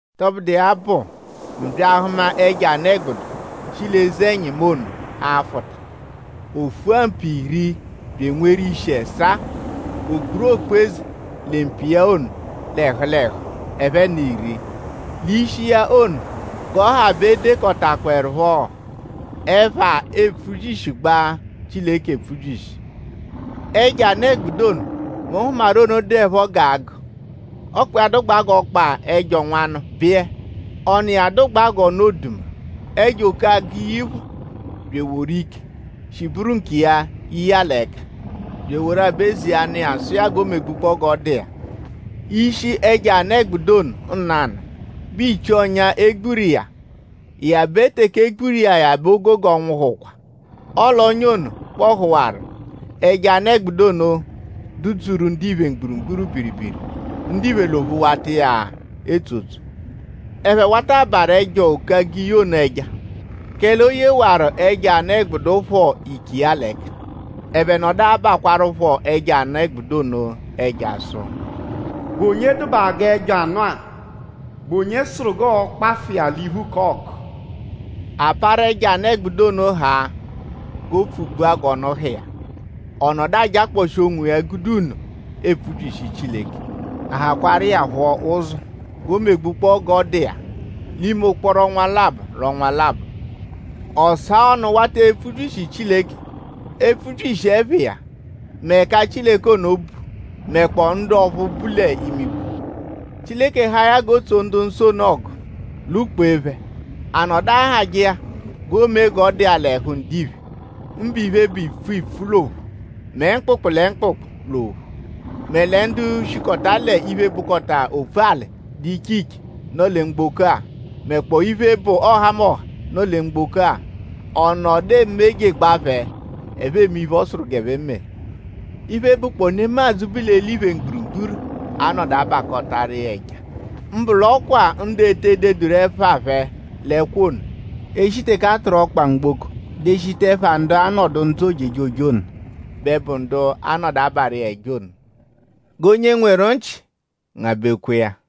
Tọbudu iya bụ mu bya ahụma ẹjo anụ-ẹgbudu, shi l'eze-ẹnyimu ono afụta. O fua mpu iri bya enweru ishi ẹsaa. O kpuru okpu-eze lẹ mpu iya ono l'ẹhu l'ẹhu ẹphe n'iri. L'ishi iya ono g'ọ ha bẹ e dekọtakpoerupho ẹpha, epfubyishigbaa Chileke epfubyishi. Ẹjo anụ-ẹgbudu ono, mu hụmaru ono dụepho g'agụ. Ọkpa iya dụgbaa g'ọkpa ẹjo nwanụ biyẹ. Ọnu iya dụgbaa g'ọnu oduma. Ẹjo-oke-agiyi phọ bya eworu ike, shi bụru nkiya ye iya l'ẹka; bya eworu aba-eze iya nụ iya sụ iya g'o megbujekpọo g'ọ dụ iya. Ishi ẹjo anụ-ẹgbudu ono nanụ bẹ ichii ọ́nyá, e gburu iya ya bẹ teke e gburu iya ya bẹ o gogo nwụhukwa. Ọle ọ́nyá ono kpọhuwaru. Ẹjo anụ-ẹgbudu ono dụ-dzuru ndiphe mgburugburu biribiri. Ndiphe l'ophu wata iya etsotso. Ẹphe wata abarụ ẹjo-oke-agiyi ono ẹja; kẹle o yewaru ẹjo anụ-ẹgbudu phọ ike iya l'ẹka. Ẹphe nọdu abakwarụpho ẹjo anụ-ẹgbudu ono ẹja sụ: “?Bụ onye dụbaa g'ẹjo anụ-a??Bụ onye sụru g'ọo-kpafụ iya l'iphu k'ọgu?” A parụ ẹjo anụ-ẹgbudu ono haa g'o pfugbua g'ọnu ha iya. Ọ nọdu ajakpọshi onwiya gude nno epfubyishi Chileke. A hakwaaru iya phọ ụzo g'o megbukpọo g'ọ dụ iya l'ime ụkporo ọnwa labọ l'ọnwa labọ. Ọ saa ọnu wata epfubyishi Chileke; epfubyishi ẹpha iya; mẹ ẹka Chileke ono bu; mẹkpoo ndu ọphu bu l'imigwe. Chileke haa ya g'o tsoje ndu-nsọ ono ọgu; lwụ-kpeje phẹ. A nọdu ahajẹ iya g'o mee g'ọ dụ iya l'ẹhu ndiphe; mbụ iphe, bụ ipfu ipfu l'ophu; mẹ mkpụkpu lẹ mkpụkpu l'ophu; mẹ lẹ ndu shikọta l'iphe, bụkota opfu-alị, dụ l'iche l'iche, nọ lẹ mgboko-a; mẹkpoo iphe, bụ ọhamoha, nọ lẹ mgboko-a; ọ nọdu emejegbaa phẹ; ẹphe eme iphe, ọ sụru g'ẹphe mee. Iphe, bụkpoo nemadzụ, bu l'eliphe mgburugburu a-nọdu abakọtaru iya ẹja. Mbụ l'ọ kwa ndu e te deduru ẹpha phẹ l'ẹkwo ono, e shi teke a tụru ọkpa mgboko deshita ẹpha ndu a-nọdu ndzụ ojejoje ono; bẹ bụ ndu a-nọdu abarụ iya ẹja ono. G'onye nweru nchị ngabẹkwa iya.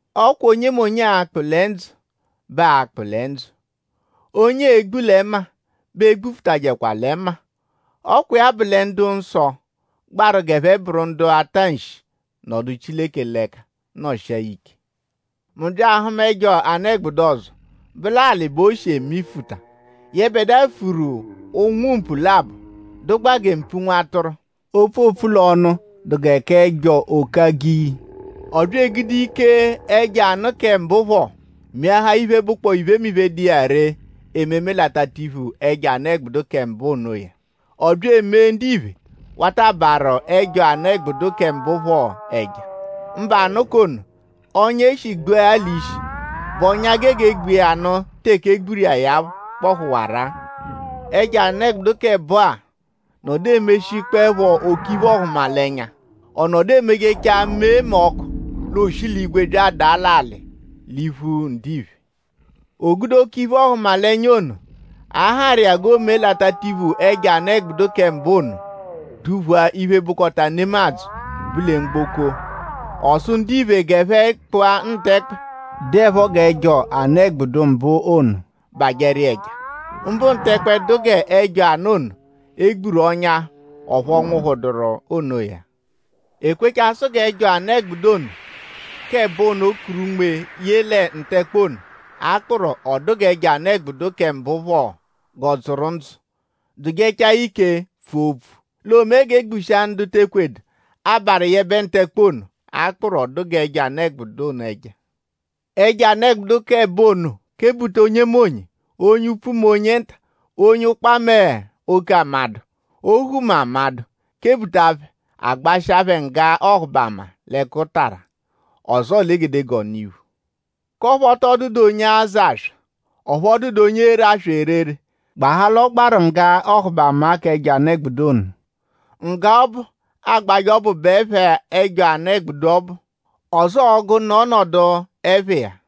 Ọ kwa onyemonye, aa-kpụ lẹ ndzụ bẹ a-kpụ lẹ ndzụ. Onye ee-gbu lẹ mma bẹ e gbufutajẹkwa lẹ mma. Ọ kwa iya bụ lẹ ndu-nsọ gbaru g'ẹphe bụru ndu a-ta nshi nọdu Chileke l'ẹka nọshia ya ike. Mu bya ahụma ẹjo anụ-ẹgbudu ọzo, bụ l'alị bẹ o shi emifuta. Yẹbedua furu ụnwu-mpu labọ, dụgbaa gẹ mpu nwa atụru; opfu, oopfu l'ọnu dụ gẹ k'ẹjo-oke-agiyi. Ọ bya egude ike ẹjo anụ kẹ mbụ phọ meahaa iphe, bụkpoo iphe, dụ iya ree ememe l'atatiphu ẹjo anụ-ẹgbudu kẹ mbụ onoya. Ọ bya emee: ndiphe wata abarụ ẹjo anụ-ẹgbudu kẹ mbụ phọ ẹja; mbụ anụ k'ono, ọ́nyá e shi gbua ya l'ishi, bụ ọ́nyá, gege gbu iya nụ teke e gburu iya ya kpọhuwaru-a. Ẹjo anụ-ẹgbudu k'ẹbo-a nọdu emeshiẹpho oke iphe-ọhumalenya. Ọ nọdu emejechaa mee ọku l'ooshi l'igwe bya adaa l'alị l'iphu ndiphe. O gude oke iphe-ọhumalenya ono, a harụ iya g'o meje l'atatiphu ẹjo anụ-ẹgbudu kẹ mbụ ono; duphua iphe, bụkota nemadzụ, bu lẹ mgboko. Ọ sụ ndiphe g'ẹphe kpụa ntẹkpe, dụepho g'ẹjo anụ-ẹgbudu mbụ ono; bajẹru iya ẹja; mbụ ntẹkpe dụ g'ẹjo anụ ono, e gburu ọ́nyá; ọphu ọ nwụhuduru onoya-a. E kwechaa sụ g'ẹjo anụ-ẹgbudu ono k'ẹbo kuru unme ye lẹ ntẹkpe ono, a kpụru: ọ dụ g'ẹjo anụ-ẹgbudu kẹ mbụ phọ g'ọ dzụru ndzụ dụjechaa ike pfua opfu; l'oomee g'e gbushia ndu te ekwedu abarụ yẹbe ntẹkpe ono, a kpụru: ọ dụ g'ẹjo anụ ono ẹja. Ẹjo anụ-ẹgbudu k'ẹbo ono kebuta onyemonye; onye upfu mẹ onye nta; onye ụkpa mẹ oke amadụ; ohu mẹ amadụ; kebuta phẹ; a gbashịa phẹ ngga ọhubama l'ẹkutara; ọzoo l'egedegee ọnu-iphu; k'ọphu ọ tọ dụdu onye azụ aswa; ọphu ọ dụdu onye ere aswa erere; gbahaa l'ọ gbaru ngga ọhubama k'ẹjo anụ-ẹgbudu ono. Ngga ọbu, aagbajẹ ọbu bụ ẹpha ẹjo anụ-ẹgbudu ọbu; ọzoo ọ́gú, nọ ọnodu ẹpha iya.